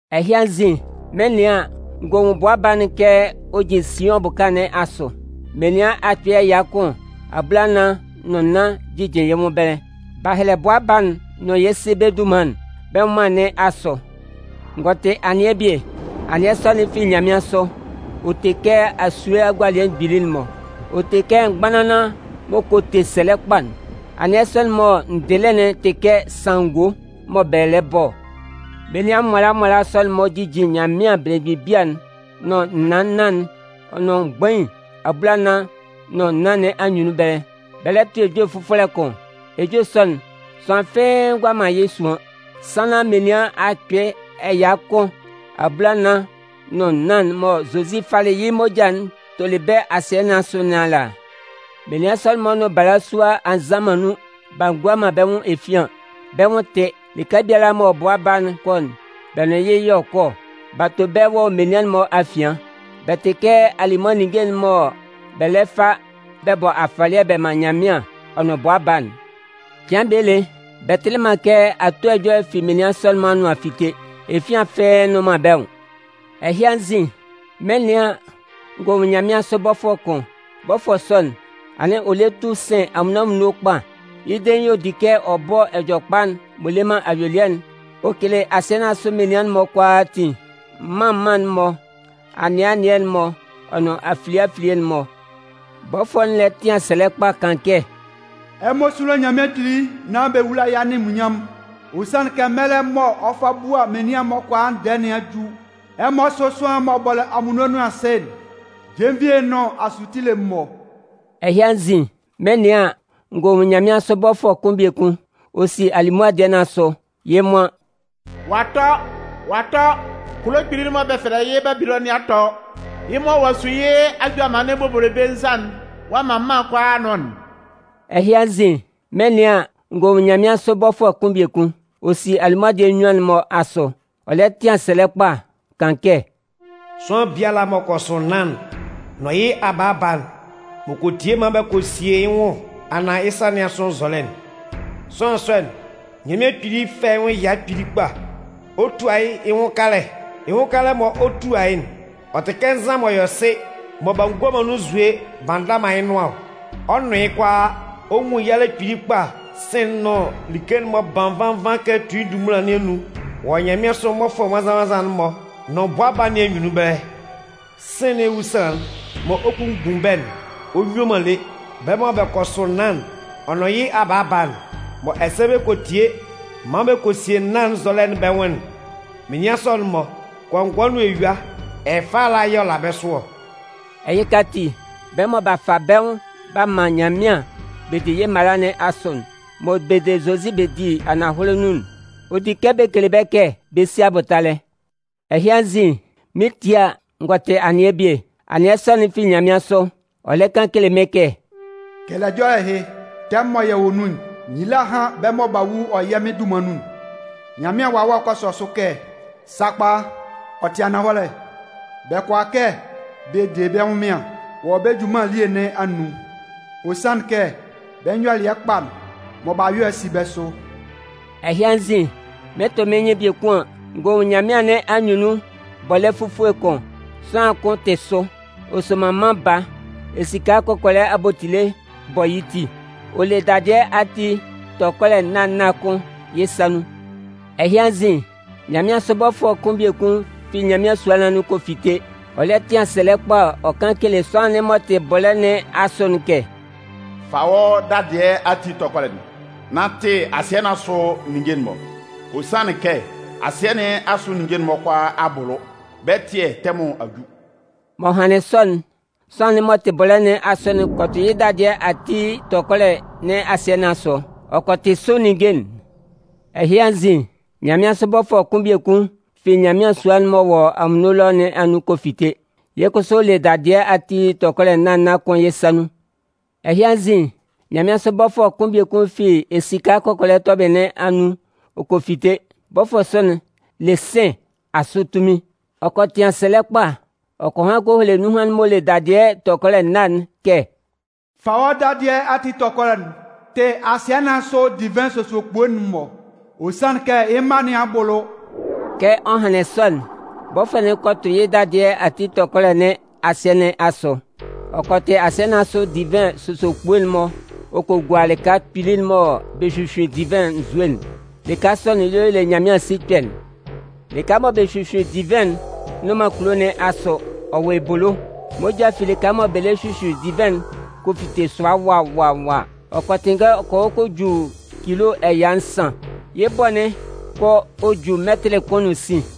Ɛhɩ anzin, mɩn 'nɩan an, n gɔ nwun Bʋa Baa'n kɛ ɔ jin Siʋn bʋka nɩn asʋ. Menian akpɩɩ ɛya kʋn abulanan nʋn nnan jijin yɩ́ nwʋn ɛbɛlɛ. B'a hɛlɛ Bʋa Baa'n nʋn yɩ́ Sɩ bɛ́ dunman'n bɛ́ nwʋnman nɩn asʋ. N gɔ tɩ anɩɛ bie. Anɩɛ sɔ'n fi nyanmɩansʋ. Ɔ te kɛ asue agualɩɛ mgbili'n-mɔ. Ɔ te kɛ mgbanlanlan m'ɔ kɔ te sɛlɛ kpa'n. Anɩɛ sɔ'n mɔ n dɩlɩ'n tɩ kɛ sanngo mɔ bɛ lɛ bɔ ɔ. Menian nwala nwala sɔ'n-mɔ jijin Nyanmɩan belemgbin bia'n, nʋn naan nnan'n ɔ nʋn mgbain abulaa nʋn nnan nɩn anyunnun ɛbɛlɛ, bɛ lɛ tʋ ejue fʋfɔlɛ kʋn. Ejue sɔ'n, sʋanlan fɩ́ɩ́ ngʋala man yɩ́ suan, sannan menian akpɩɩ ɛya kʋn abulanan nʋn nnan'n mɔ Zozi falɩ yɩ́ moja'n tolɩ bɛ́ asɩɛ nɩn asʋ nɩn ala. Menian sɔ'n-mɔ nʋn balasua a nzan man nun b'a ngua man bɛ́ nwʋn efian. Bɛ́ nwʋn tɩ. Lɩka biala mɔ bʋa Baa'n 'kɔ'n, bɛ́ nʋn yɩ́ yɛ̂ ɔ kɔ ɔ. B'a to bɛ́ wɔ menian'n-mɔ afian. Bɛ tɩ kɛ alimʋa ninnge mɔ bɛ lɛ fa bɛ bɔ afɔlɩɛ bɛ man Nyanmɩan ɔ nʋn Bʋa Baa'n. Cɩan bie lé, bɛ tɩlɩ man kɛ ato ɛjɔlɛ fi menian sɔ'n-mɔ anʋan a fite. Efian fɩ́ɩ́ nnʋn man bɛ́ nwʋn. Ɛhɩ anzin, mɩn 'nɩan an, n gɔ nwun nyanmɩansʋ bɔfʋɛ kʋn. Bɔfʋɛ sɔ'n, anɩn ɔ lɛ tu sɩn anwunno anwunno kpa. Yɩ́ dein y'ɔ di kɛ ɔ bɔ Ɛjɔlɛkpa'n m'ɔ le man ayuelɩɛ'n ɔ kele asɩɛ nɩn asʋ menian'n-mɔ kʋalaatin, mân mân'n-mɔ, anɩɛ anɩɛ'n-mɔ, ɔ nʋn afilie afilie'n-mɔ. Bɔfʋɛ'n lɛ tɩan sɛlɛ kpa kan kɛ: “Ɛmɔ súlo Nyanmɩan Kpili nán bɛ wúla yɩ́ anunminnyanmʋn! ɔ sanlɩn kɛ mɛlɛ'n mɔ ɔ 'fa bua menian'n-mɔ kʋalaa ndɛɛ nɩn a ju. Ɛmɔ sʋ́ sʋanlan'n m'ɔ bɔlɩ anwunno nʋn asɩɛ'n, jenvie'n nʋn asutile'n-mɔ'n.” Ɛhɩ anzin, mɩn 'nɩan an, n gɔ nwun nyanmɩansʋ bɔfʋɛ kʋn biekun. Ɔ si alimʋa dɩɛ nɩn asʋ. Yɩ́ nwan: “Ɔ'a tɔ! Ɔ'a tɔ! Kulo kpili'n mɔ bɛ fɛlɛ yɩ́ Babilɔnʋn nɩn a tɔ! Yɩ́ mɔ ɔ'a su yɩ́ ajʋamannɩn bobolobe nzan'n ɔ'a man mân kʋalaa a nʋn'n!” Ɛhɩ anzin, mɩn 'nɩan an, n gɔ nwun nyanmɩansʋ bɔfʋɛ kʋn biekun. Ɔ si alimʋa dɩɛ nnyuan'n-mɔ asʋ. Ɔ lɛ tɩan sɛlɛ kpa kan kɛ: “Sʋanlan biala m'ɔ kɔ sʋ naan'n nʋn yɩ́ abaaba'n, m'ɔ kɔ tie maan bɛ kɔ sie yɩ́ nwʋnman anaan yɩ́ sa nɩn asʋ nzɔlɛ'n, sʋanlan sɔ'n, Nyanmɩan Kpili 'fɛ yɩ́ nwʋn ɛya kpili kpa, ɔ 'tua yɩ́ yɩ́ nwʋn kalɛ. Yɩ́ nwʋn kalɛ mɔ ɔ 'tua yɩ́'n, ɔ tɩ kɛ nzan m'ɔ yɔ sɩ, mɔ b'a ngua man nun nzue b'a nda man yɩ́ nʋan ɔ. Ɔ 'nʋn yɩ́ kʋalaa. Ɔ 'nwun yalɛ kpili kpa sɩ̂n'n nʋn like'n m'ɔ ban nvan nvan kɛ tui ndunmunlan nɩn anun wɔ nyanmɩansʋ mmɔfʋɛ nwannzan-nwannzan'n-mɔ nʋn Bʋa Baa nɩn anyunnun ɛbɛlɛ. Sɩ̂n nɩn ewusanlan'n mɔ ɔ 'kpunmgbun bɛ́'n, ɔ nyue man lé. Bɛ́ mɔ bɛ kɔ sʋ naan'n, ɔ nʋn yɩ́ abaaba'n, mɔ ɛsɛ bɛ kɔ tie maan bɛ kɔ sie naan'n nzɔlɛ'n bɛ́ nwʋn'n, menian sɔ'n-mɔ, kɔngɔɛ nʋn eyua, ɛfɛ ala yɛ̂ ɔ la bɛ́ sʋ ɔ.” Ɛhɩka ati, bɛ́ mɔ b'a fa bɛ́ nwʋn b'a man Nyanmɩan bɛ di yɩ́ mala nɩn asʋ, mɔ bɛ de Zozi bɛ di ananhɔlɛ nun'n, ɔ di kɛ bɛ kele kɛ bɛ si abʋtalɛ. Ɛhɩ anzin, mɩn 'tie a, n gɔ tɩ anɩɛ bie. Anɩɛ sɔ'n fi nyanmɩansʋ. Ɔ lɛ kan kele mɩ́n kɛ: “Kɛlɛ ɛjɔlɛ ɛhɩ: Tɛmʋn mɔ yɛ wɔ nun'n, nyila hán bɛ́ mɔ bɛ wu wɔ yɛ́ Mɩn dunman nun'n!” Nyanmɩan Wawɛ'n kɔ sɔ sʋ kɛ: “Sakpa, ɔ tɩ ananhɔlɛ. Bɛ kʋala kɛ bɛ de bɛ́ ɛnwʋnmɩan wɔ́ bɛ́ junman elie nɩn anun. Ɔ sanlɩn kɛ bɛ́ nyɔlɩɛ kpa'n mɔ b'a yɔ'n si bɛ́ sʋ.” Ɛhɩ anzin, mɩn 'tʋ mɩ́n nyɩn biekun an, n gɔ nwun nyanmɩan nɩn anyunnun bɔlɛ́ fufue kʋn. Sʋanlan kʋn tɩ sʋ, ɔ soman Mân Baa. Esika kɔkɔlɛ abotile bɔ yɩ́ ti. Ɔ le dadɩɛ ati tɔkɔlɛ nâ nâ kʋn yɩ́ sa nun. Ɛhɩ anzin, nyanmɩansʋ bɔfʋɛ kʋn biekun fi Nyanmɩan sua nɩn anun kɔ fite, ɔ lɛ tɩan sɛlɛ kpa ɔ kan kele sʋanlan'n m'ɔ tɩ bɔlɛ́ nɩn asʋ'n kɛ: “Fa wɔ́ dadɩɛ ati tɔkɔlɛ'n, nán tɩ asɩɛ nɩn asʋ ninnge'n. Ɔ sanlɩn kɛ asɩɛ nɩn asʋ ninnge'n kʋalaa a bʋlʋ, bɛ́ ɛtɩɛ tɛmʋn a ju.” M'ɔ hanlɩn sɔ'n, sʋanlan'n m'ɔ tɩ bɔlɛ́ nɩn asʋ'n kɔ tʋ yɩ́ dadɩɛ ati tɔkɔlɛ nɩn asɩɛ nɩn asʋ, ɔ kɔ tɩ sʋ ninnge'n. Ɛhɩ anzin, nyanmɩansʋ bɔfʋɛ kʋn biekun fi Nyanmɩan sua'n m'ɔ wɔ anwunno ɛlɔ nɩn anun kɔ fite. Yɩ́ kʋsʋ ɔ le dadɩɛ ati tɔkɔlɛ nâ nâ kʋn yɩ́ sa nun. Ɛhɩ anzin, nyanmɩansʋ bɔfʋɛ kʋn biekun fi esika kɔkɔlɛ tɔbɩlɩ nɩn anun ɔ kɔ fite. Bɔfʋɛ sɔ'n le sɩ̂n nɩn asʋ tunmin. Ɔ kɔ tɩan sɛlɛ kpa ɔ kɔ han kɔ hele nunhan'n m'ɔ le dadɩɛ tɔkɔlɛ nâ'n kɛ: “Fa wɔ́ dadɩɛ ati tɔkɔlɛ'n tɩ asɩɛ nɩn asʋ divɩn sosokpue'n-mɔ, ɔ sanlɩn kɛ yɩ́ mma nɩn a bʋlʋ.” Kɛ ɔ hanlɩn sɔ'n, bɔfʋɛ'n kɔ tʋ yɩ́ dadɩɛ ati tɔkɔlɛ nɩn asɩɛ nɩn asʋ. Ɔ kɔ tɩ asɩɛ nɩn asʋ divɩn sosokpue'n-mɔ ɔ kɔ gua lɩka kpili'n mɔ bɛ hyuhyuin divɩn nzue'n. Lɩka sɔ'n y'ɔ le Nyanmɩan sikpɛ'n. Lɩka mɔ bɛ 'hyuhyuin divɩn'n nnʋn man kulo nɩn asʋ, ɔ wɔ ebolo. Moja fi lɩka mɔ bɛ lɛ hyuhyuin divɩn'n kɔ fite sʋa wa wa wa. Ɔ kɔ tɩnngɛ ɔ kɔ hɔ kɔ ju cilo ɛya nsan. Yɩ́ bʋ'n kɔ ɔ ju mɛtɩlɩ kʋn nʋn sin.